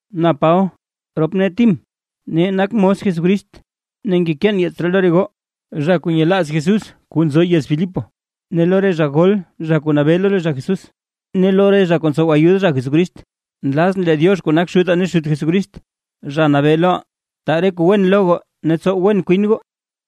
Na Paba, rop nee Tim, nee nak mos Jesucrist, ne ngekeen yeets ree lo re goo zha kuu nyelaaz Jesús kuu nzo yez Filipo; ne lo re zha gol kuu nabee lo re zha Jesús; ne lo re zha kuu ntsow ayud re zha Jesucrist. Nlazʼn lee Diox kuu nak Xutaa ne Xut Jesucrist, Zha Nabee loʼaa, taa re kuu wen lo goo ne tsow wen kwin goo.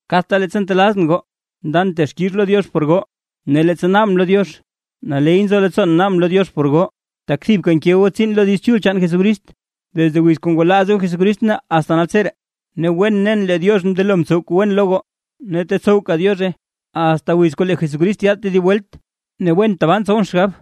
Kadta leettsa ntelaazʼn goo ndan texkix lo Diox por goo. Ne leettsa naabʼn lo Diox, naley nzo leettsoon naabʼn lo Diox por goo; tak thibka nke goo tsiin lo Diiz Chul chaan Jesucrist, desde wiz kuu ngwalaaz goo Jesucrist ne asta naltseree. Ne wen nen lee Diox mndelo mtsow kuu wen lo goo ne tetsowka Diozhe, asta wiz kuu lee Jesucrist yaad tedib welt. Ne wen tabaa ntsowʼn xgab,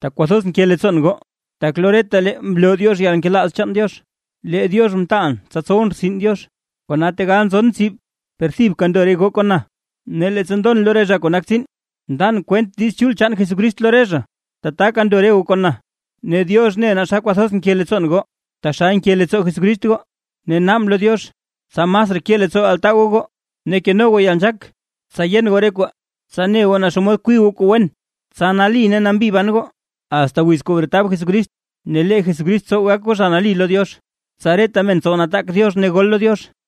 tak kwathoz nke leettsoon goo, tak lo retalee mloo Diox yalnkelaaz chaan Diox. Lee Diox mtaalʼn tsa tsowʼn rtsin Diox, kona tegal nzon tsib per thibka ndo re goo kon na, ne leettsa ndon lo re zha kuu nak tsiin ndan kwent Diiz Chul chaan Jesucrist lo re zha, tataka ndo re goo kon na. Ne Diox ne naa xa kwathoz nke leettsoon goo taxal nke leettsoo Jesucrist goo, ne naabʼn lo Diox, tsa masraa ke leettsoo altaa goo goo ne keno goo yalnzhaak tsa yen goo re kwaa. Tsa ne goo naa xomod kwii goo kuu wen. Tsa nali ne nambi ban goo asta wiz kuu bretab Jesucrist. Ne lee Jesucrist tsow gak goo zha nali lo Diox. Tsa reta men tsow nataak Diox ne gol lo Diox.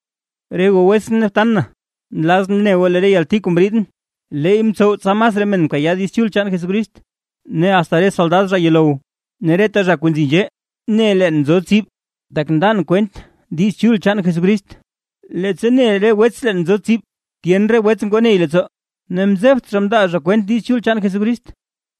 Re goo wetsʼn ne btan na, nlazʼn ne goo lee re yalti kuu mriidʼn, leey mtsow tsa masraa men mkayaa Diiz Chul chaan Jesucrist. Ne asta reta soldad zha yuulow, ne reta zha kuu nzi nzhee, ne leen nzo tsib, tak ndan kwent Diiz Chul chaan Jesucrist. Ne leettsa ne re wets leen nzoo tsib, tyen re wets ngoo ney leettsoo, ne mzebt mndaa zha kwent Diiz Chul chaan Jesucrist,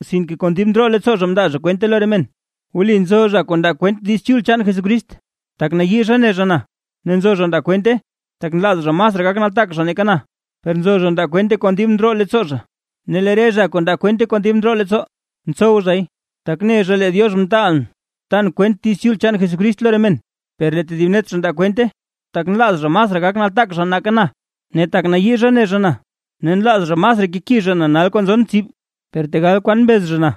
sinke kon dib ndroo leettsoo zha mndaa zha kwente lo re men. Wli nzo zha kuu ndaa kwent Diiz Chul chaan Jesucrist, tak nayii zha ne zha na, ne nzo zha ndaa kwente, tak nlaaz zha masraa gak nataak zha nake na, per nzo zha ndaa kwente kon dib ndroo leettsoo zha. Ne lee re zha kuu nda kwente kon dib ndroo leettsoo, ntsow zhay, tak ne zha lee Diox mtaalʼn tan kwent Diiz Chul chaan Jesucrist lo re men, per lee tedib net zha ndaa kwente, tak nlaaz zha masraa gak nataak zha nake na, ne tak nayii zha ne zha na, ne nlaaz zha masraa keki zha na nal kuu nzon tsib. Per tegal kwan mbez zha na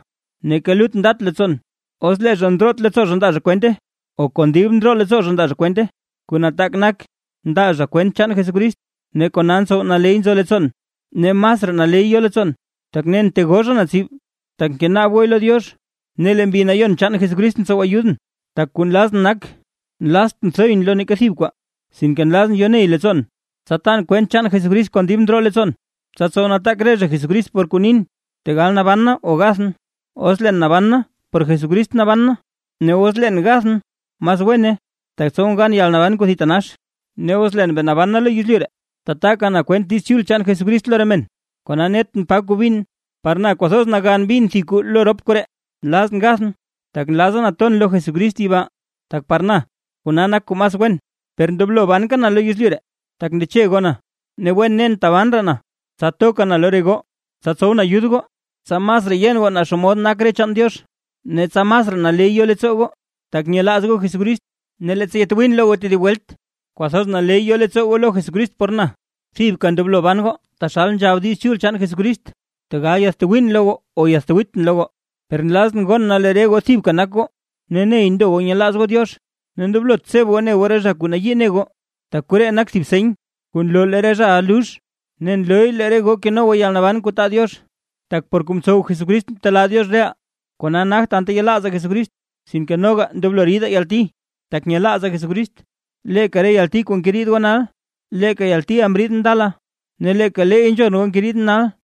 neeka lut ndat leettsoon, os lee zha ndroot leettsoo zha ndaa zha kwente o kon dib ndroo leettsoo zha ndaa zha kwente, kuu nataak nak ndaa zha kwent chaan Jesucrist ne kona ntsow naley nzo leettsoon. Ne masraa naley yo leettsoon, tak nen tegoo zha na tsib, tak ngenaab gooy lo Diox ne lee Mbi Nayon chaan Jesucrist ntsow ayudʼn. Tak kuu nlazʼn nak, nlaaztʼn thoyʼn lo neeka thib kwaa, sinke nlazʼn yoney leettsoon, tsa tan kwent chaan Jesucrist kon dib ndroo leettsoon, tsa tsow nataak re zha Jesucrist por kuu nin, tegal naban na o gathʼn. Os leen naban na por Jesucrist naban na, ne os leen gathʼn mas wene, tak tsowʼn gan yalnaban kuu thitanax. Ne os leen bee naban na lo yezlyu ree, tataka na kwent Diiz Chul chaan Jesucrist lo re men; kona netʼn pa kuu bin. Par na kwathoz nagan bin thib kuu lo rop koree: Nlazʼn gathʼn, tak nlaza na ton lo Jesucrist yibaa, tak par na kona nak kuu mas wen. Per ndoblo banka na lo yezlyu ree, tak ndeche goo na. Ne wen nen taban raa na, tsa toka na lo re goo, tsa tsowʼn ayud goo, tsa masraa yen goo naa xomod nak re chaan Diox ne tsa masraa naley yo leettsoo goo, tak nyelaaz goo Jesucrist. Ne leettsa yatwiin lo goo tedib welt, kwathoz naley yo leettsoo goo lo Jesucrist por na. Thibka ndoblo ban goo, taxal nzhab Diiz Chul chaan Jesucrist. Tegal yatwiin lo goo o yatwiitʼn lo goo, per nlazʼn gon na lee re goo thibka nak goo, ne ney ndo goo nyelaaz goo Diox. Ne ndoblot tseb goo ne goo re zha kuu nayii ne goo. Tak koree nak thib seny kuu nloo lee re zhaʼa lux, ne nlooy lee re goo keno goo yalnaban kuu taa Diox. Tak por kuu mtsow Jesucrist mtelaa Diox reʼaa kona nagt anta yelaazaa Jesucrist, sinke noga ndoblo ridaa yalti, tak nyelaazaa Jesucrist. Leeka re yalti kuu ngeriid goo nal, leeka yaltiʼa mriidʼn ndala ne leeka leey nzhon goo ngeriidʼn nal.